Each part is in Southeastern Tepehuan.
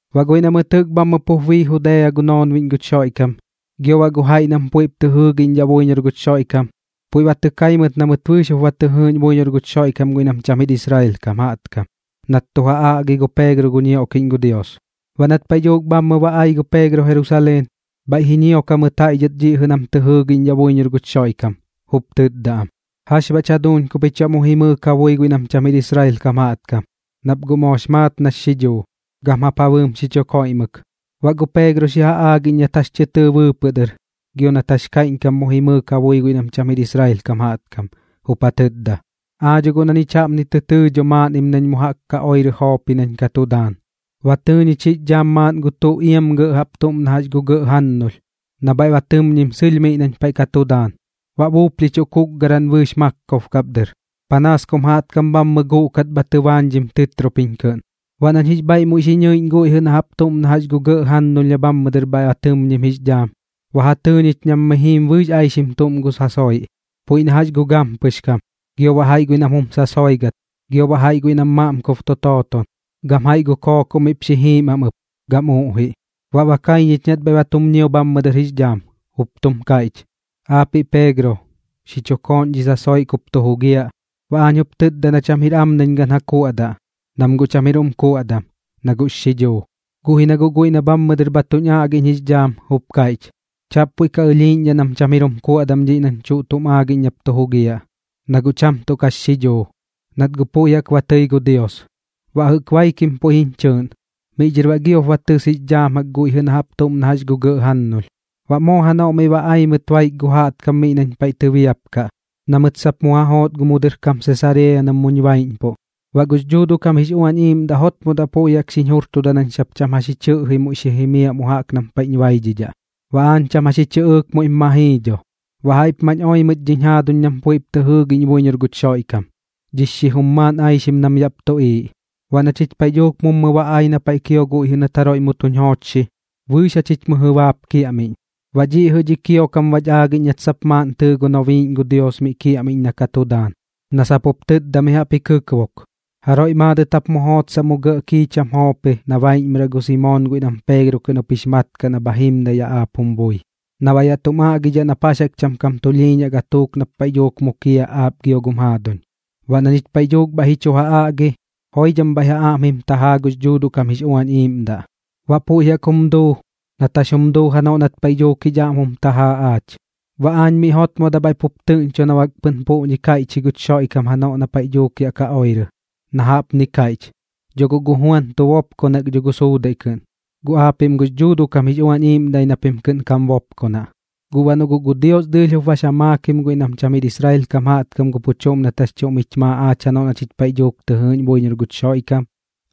Baꞌ guiꞌ na mɨt jɨꞌk bhammɨ pup bii Judea gu noonbiꞌñ guch Xoiꞌkam, gio baꞌ gu jaiꞌ guiꞌ nam puiꞌp tɨ jɨɨgiꞌñdhaꞌ buiñor guch Xoiꞌkam, puiꞌ ba tɨ kai mɨt na mɨt bɨɨx jup ba tɨ jɨɨꞌñ buiñor guch Xoiꞌkam guiꞌ nam cham jir Israel kam jaꞌtkam nat tu ja aꞌgi gu Peegro gu ñioꞌkiꞌñ gu Dios. Baꞌ nat paiꞌ dhuuk bhammɨ ba ai gu Peegro Jerusaleen, bhaiꞌ ji ñiok jamɨt jaiꞌ dhɨt dhiꞌ jɨꞌ nam tɨ jɨɨgiꞌñdhaꞌ buiñor guch Xoiꞌkam, jup tɨtda am: ―¿Jax baꞌch jaduuñ ku pich baꞌ mu jimɨɨk ja bui guiꞌ nam cham jir Israel kam jaꞌtkam? Nap guꞌ moox maat nax xidhuu, gam jap ja bɨɨm xi chu koiꞌmɨk. Baꞌ gu Peegro xi ja aagiꞌñ nat jax tɨ tɨɨ bɨɨpɨꞌ dɨr gio nat jax kaiꞌñkam mu jimɨɨk ja bui guiꞌ nam cham jir Israel kam jaꞌtkam, jup ja tɨtda: ―Aa dho guꞌ na ñich jaꞌpni tɨ tɨɨ dho maaꞌnnim nañ mu jaꞌk ka oirɨ Joopi nañ ka tu daan. Ba tɨɨ ñich jix dhaam maaꞌn gu tuꞌ iam gɇꞌ jaꞌp tuꞌm na jax gu gɇꞌ jannulh na bhaiꞌ ba tɨmñim sɨlh miꞌ nañ paiꞌ ka tu daan, baꞌ buuplhichuꞌ kuukgaran bɨɨx maakob kap dɨr, panaas kum jaꞌtkam bhammɨ guꞌkat bha tɨbaañdhim tɨtropiñ kɨꞌn. Baꞌ nañ jix bhaiꞌ muiꞌ xi nɨiꞌñ guiꞌ jɨꞌ na jaꞌp tuꞌm na jax gu gɇꞌ jannulh na bhammɨ dɨr bhaiꞌ ba tɨmñim jix dhaam, ba ja tɨɨ ñich nam mi jiim bɨɨx aixim tuꞌm gu sasoiꞌ, puiꞌ na jax gu gampɨx kam, gio baꞌ jaiꞌ guiꞌ nam jum sasoigat, gio baꞌ jaiꞌ guiꞌ nam maaꞌmkob tu tooton, gam jaiꞌ gu kookoꞌ miꞌp xi jiim am ɨp, gam uꞌjiꞌ. Baꞌ ba kai ñich nat bhaiꞌ ba tum ñio bhammɨ dɨr jix dhaam, jup tum kaiꞌch: “Aapiꞌ Peegro, xi chu kooꞌn dhi sasoiꞌ kup tu jugiaꞌ.” Baꞌ aañ jup tɨtda na cham jir am nañ gan ja kuaꞌdaꞌ, nam guꞌ cham jir jum kuaꞌdam, na guꞌx xidhuu. Guꞌ ji na guꞌ guiꞌ na bhammɨ dɨr bha tuñ aꞌgiꞌñ jix dhaam jup kaiꞌch: “Chaꞌp puiꞌ ka ɨlhiiꞌñdhaꞌ nam cham jir jum kuaꞌdam dhiꞌ nañ tuꞌm aagiꞌñ nap tu jugiaꞌ, na guꞌ cham tuꞌ kax xidhuu, nat guꞌ puiꞌ jaꞌk ba tɨi gu Dios.” Baꞌ jɨꞌk baikim puiꞌñ chɨɨꞌn, miꞌ dhɨr baꞌ giop ba tɨs jix dhaam guiꞌ jɨꞌ na jaꞌp tuꞌm na jax gu gɇꞌ jannulh. Baꞌ moo janoꞌ miꞌ ba ai mɨt baik gu jaꞌtkam miꞌ nañ paiꞌ tɨbiapkaꞌ na mɨt sap mu ja joot mu dɨr Sesareeya nam muñ baiꞌñpuꞌ. Baꞌ gux Dhuuduꞌ kam jix Uañ Iiꞌmdaꞌ jotmodaꞌ puiꞌ jaꞌk xiñ jurtudak nañ sap cham jax ji chɨꞌji muiꞌ xi jimiaꞌ mu jaꞌk nam paiꞌñ baidhidhaꞌ. Baꞌ aañ cham jax ji chɨꞌɨɨk muiꞌp ma jii dho. Baꞌ jaiꞌp mañ oi mɨt dhiñ jaaduñ nam puiꞌp tɨ jɨɨgiꞌñ buiñor guch Xoiꞌkam, dhi xijum maaꞌn aixim nam yaꞌp tuꞌiiꞌ. Baꞌ na chich paiꞌ dhuuk mummɨ ba ai na paiꞌ kio guiꞌ jɨꞌ nat jaroiꞌ mu tuñ joochxi, bɨɨx jachich mɨjɨ baap kiaꞌmiꞌñ. Baꞌ dhiꞌ jɨꞌ dhi kiokam bach aagiꞌñ nat sap tɨɨ maaꞌn gu nobiiꞌñ gu Dios mi kiaꞌmiꞌñ na ka tu daan, na sap jup tɨtda mi jaꞌp ji kɨkbok: “Jaroiꞌ maadɨt jap mu jootsaꞌ mu gɇꞌ kiicham Joopi na baiꞌñmɨraꞌ gu Simoon guiꞌ nam Peegro kɨꞌn jup jix mat kaꞌ na bha jimdaꞌ yaꞌ aap jum bui, na baꞌ yaꞌ tum aꞌgidhaꞌ nap jax jaꞌk cham kam tulhiiñaꞌ gatuuk nap paiꞌ dhuuk mukiaꞌ aap gio gum jaaduñ.” Baꞌ na ñich paiꞌ dhuuk bhaiꞌ ji chu ja aꞌgi, joidham bhaiꞌ ja aꞌm jim tajaa gux Dhuuduꞌ kam jix Uañ Iiꞌmdaꞌ. Baꞌ puiꞌ jaꞌk jup jum duu nat jax jum duu janoꞌ nat paiꞌ dhuuk jich aꞌm jum tajaa aach. Baꞌ aañ miꞌ jotmodaꞌ bhaiꞌ pup tɨꞌñcho na bak guꞌ pɨn puꞌñi kaiꞌch ji guch Xoiꞌkam janoꞌ na paiꞌ dhuuk yaꞌ ka oirɨ, na jaꞌpni kaiꞌch: “Dho guꞌ gu Juan tu bopkonak dho gu suudaiꞌ kɨꞌn, guꞌ aapiꞌm gux Dhuuduꞌ kam jix Uañ Iiꞌmdaꞌ ji na pim kɨꞌn kam bopkonaꞌ.” Guꞌ baꞌ noꞌ guꞌ gu Dios dɨɨlh jup bax ja maakim guiꞌ nam cham jir Israel kam jaꞌtkam gu pu chuꞌm nat jax chuꞌm jich maa aach janoꞌ na chich paiꞌ dhuuk tɨ jɨɨꞌñ buiñor guch Xoiꞌkam,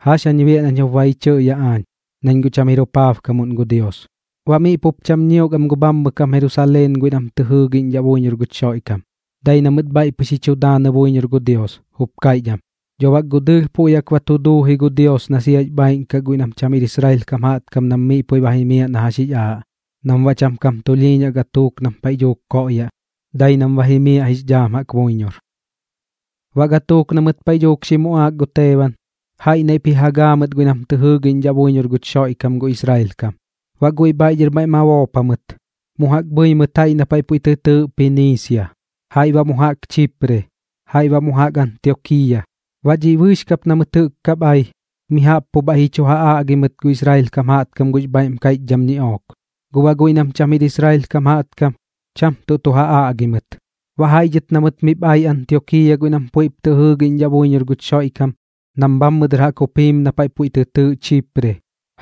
¿jax jañ biaꞌ nañ jup ba ji chɨꞌyaꞌ aañ, nañ guꞌ cham jir jupaabkamuꞌn gu Dios? Baꞌ miꞌ pup cham ñiok am gu bhammɨ kam Jerusaleen guiꞌ nam tɨ jɨɨgiꞌñdhaꞌ buiñor guch Xoiꞌkam, dai na mɨt bhaiꞌ pɨx ji chu daanɨ buiñor gu Dios, jup kaiꞌch am: ―Dho bak guꞌ dɨɨlh puiꞌ jaꞌk ba tu duu ji gu Dios na siax bhaaiꞌn kaꞌ guiꞌ nam cham jir Israel kam jaꞌtkam nam miꞌ puiꞌ ba jimiaꞌ na jax jix aaꞌ, nam baꞌ cham kam tulhiiñaꞌ gatuuk nam paiꞌ dhuuk koꞌyaꞌ, dai nam ba jimiaꞌ jix dhaam jaꞌk buiñor. Baꞌ gatuuk na mɨt paiꞌ dhuuk xi muꞌaak gu Teeban, jaiꞌ naiꞌp ji ja gaa mɨt guiꞌ nam tɨ jɨɨgiꞌñdhaꞌ buiñor guch Xoiꞌkam gu Israel kam. Baꞌ guiꞌ bhaiꞌ dhɨr maiꞌ ma boop jamɨt, mu jaꞌk bhɨi mɨt jaiꞌ na paiꞌ puiꞌ tɨ tɨɨꞌ Piniisia, jaiꞌ baꞌ mu jaꞌk Chipre, jaiꞌ baꞌ mu jaꞌk Antiokiiya. Baꞌ dhiꞌ bɨɨx kap na mɨt jɨꞌk kap ai, mi jaꞌp pu bhaiꞌ ji chu ja aꞌgi mɨt gu Israel kam jaꞌtkam gux bhaiꞌm kaiꞌchdham ñiꞌook, guꞌ baꞌ guiꞌ nam cham jir Israel kam jaꞌtkam, cham tuꞌ tu ja aꞌgi mɨt. Baꞌ jaiꞌ dhɨt na mɨt miꞌp ai Antiokiiya guiꞌ nam puiꞌp tɨ jɨɨgiꞌñdhaꞌ buiñor guch Xoiꞌkam nam bhammɨ dɨr jaꞌk jup jiim na paiꞌ puiꞌ tɨ tɨɨꞌ Chipre,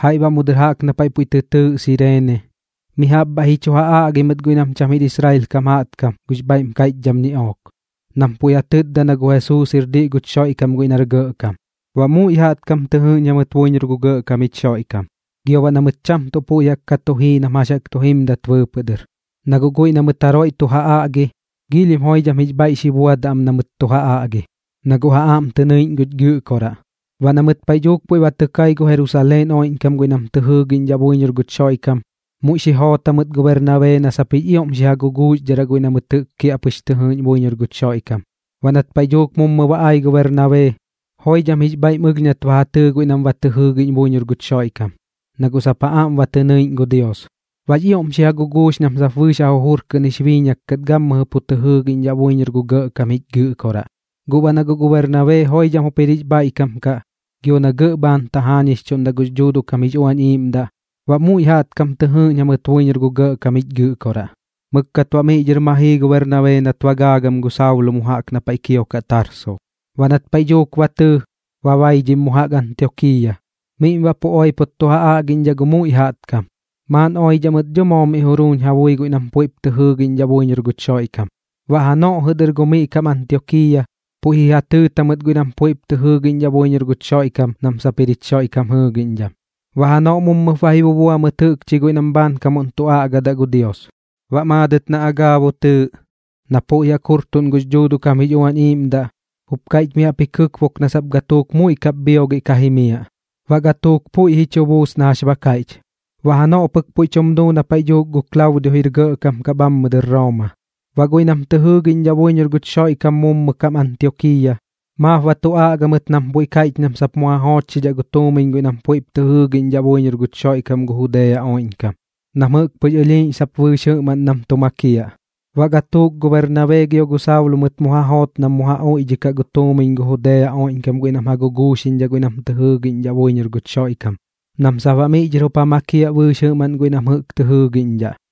jaiꞌ baꞌ mu dɨr jaꞌk na paiꞌ puiꞌ tɨ tɨɨꞌ Sireene, mi jaꞌp bhaiꞌp ji chu ja aꞌgi mɨt guiꞌ nam cham jir Israel kam jaꞌtkam gux bhaiꞌm kaiꞌchdham ñiꞌook, nam puiꞌ ja tɨtda na gu Jesuus jir diꞌ guch Xoiꞌkam guiꞌ nar Gɇꞌkam. Baꞌ muiꞌ jaꞌtkam tɨ jɨɨꞌñ jamɨt buiñor gu Gɇꞌkam jich Xoiꞌkam, gio baꞌ na mɨt cham tuꞌ puiꞌ jaꞌk ka tu jii nam jax jaꞌk ka tu jimdat bɨɨpɨꞌ dɨr, na guꞌ guiꞌ na mɨt jaroiꞌ tu ja aꞌgi, giilhim joidham jix bhaiꞌ xi buadaꞌ am na mɨt tu ja aꞌgi, na guꞌ ja aꞌm tɨ nɨiꞌñ guch Gɨꞌkoraꞌ. Baꞌ na mɨt paiꞌ dhuuk puiꞌ ba tɨ kai gu Jerusaleen oiꞌñkam guiꞌ nam tɨ jɨɨgiꞌñdhaꞌ buiñor guch Xoiꞌkam, muiꞌ xi joot jamɨt gu Bernabee na sap jix ioꞌm xi ja guguuxdharaꞌ guiꞌ na mɨt kiaꞌpɨx ba tɨ jɨɨꞌñ buiñor guch Xoiꞌkam. Baꞌ nat paiꞌ dhuuk mummɨ ba ai gu Bernabee, joidham jix bhaiꞌm ɨlh nat ba ja tɨɨ guiꞌ nam ba tɨ jɨɨgiꞌñ buiñor guch Xoiꞌkam, na guꞌ sap ja aꞌm ba tɨ ñɨiꞌñ gu Dios. Baꞌx ioꞌm xi ja guguux nam sap bɨɨx ja jujur kɨꞌn jix biiñak kat gammɨjɨ pu tɨ jɨɨgiꞌñdhaꞌ buiñor gu Gɇꞌkam jich Gɨꞌkoraꞌ. Guꞌ baꞌ na guꞌ gu Bernabee joidham jup jir jix bhaiꞌkam kaꞌ gio na gɇꞌ bhaan tajaañixchuꞌndaꞌ gux Dhuuduꞌ kam jix Uañ Iiꞌmdaꞌ, baꞌ muiꞌ jaꞌtkam tɨ jɨɨꞌñ jamɨt buiñor gu Gɇꞌkam jich Gɨꞌkoraꞌ. Mɨkkat baꞌ miꞌ dhɨr ma jii gu Bernabee nat ba gaagam gu Saulo mu jaꞌk na paiꞌ kiokaꞌ Tarso. Baꞌ nat paiꞌ dhuuk ba tɨɨ, ba baidhim mu jaꞌk Antiokiiya. Miꞌm baꞌ pu oipot tu ja aꞌgiꞌñdhaꞌ gu muiꞌ jaꞌtkam, maaꞌn oidhaꞌ mɨt dho moo miꞌ juruuñ ja bui guiꞌ nam puiꞌp tɨ jɨɨgiꞌñdhaꞌ buiñor guch Xoiꞌkam. Baꞌ janoꞌ jɨꞌ dɨr gu miꞌ kam Antiokiiya, puiꞌ ji ja tɨɨt jamɨt guiꞌ nam tɨ jɨɨgiꞌñdhaꞌ buiñor guch Xoiꞌkam nam sap jir jich Xoiꞌkam jɨɨgiꞌñdham. Baꞌ janoꞌ mummɨp ba ji bubua mɨt jɨꞌkchi guiꞌ nam bhaankamuꞌn tu aꞌgadaꞌ gu Dios. Baꞌ maadɨt na Agaabo tɨɨꞌ, na puiꞌ jaꞌk jurtuꞌn gux Dhuuduꞌ kam jix Uañ Iiꞌmdaꞌ, jup kaiꞌch mi jaꞌp ji kɨkbok na sap gatuuk muiꞌ kap bhiogiꞌ ka jimiaꞌ. Baꞌ gatuuk puiꞌ ji chu buus na jax ba kaiꞌch, baꞌ janoꞌ pɨk puiꞌ tum duu na paiꞌ dhuuk gu Klaudio jir gɇꞌkam kaꞌ bhammɨ dɨr Rooma. Baꞌ guiꞌ nam tɨ jɨɨgiꞌñdhaꞌ buiñor guch Xoiꞌkam mummɨ kam Antiokiiya, maap ba tu aꞌga mɨt nam puiꞌ kaiꞌch nam sap mu ja joochxidhaꞌ gu tuumiñ guiꞌ nam puiꞌp tɨ jɨɨgiꞌñdhaꞌ buiñor guch Xoiꞌkam gu Judea oiꞌñkam, nam jɨꞌk pɨx ɨlhiiꞌñ sap bɨɨx jɨꞌmaꞌn nam tu makiaꞌ. Baꞌ gatuuk gu Bernabee gio gu Saulo mɨt mu joot nam ja uiꞌdhikaꞌ gu tuumiñ gu Judea oiꞌñkam guiꞌ nam ja guguuxiꞌñdhaꞌ guiꞌ nam tɨ jɨɨgiꞌñdhaꞌ buiñor guch Xoiꞌkam, nam sap baꞌ miꞌ dhɨr jup ja makiaꞌ bɨɨx jɨꞌmaꞌn guiꞌ nam jɨꞌk tɨ jɨɨgiꞌñdhaꞌ.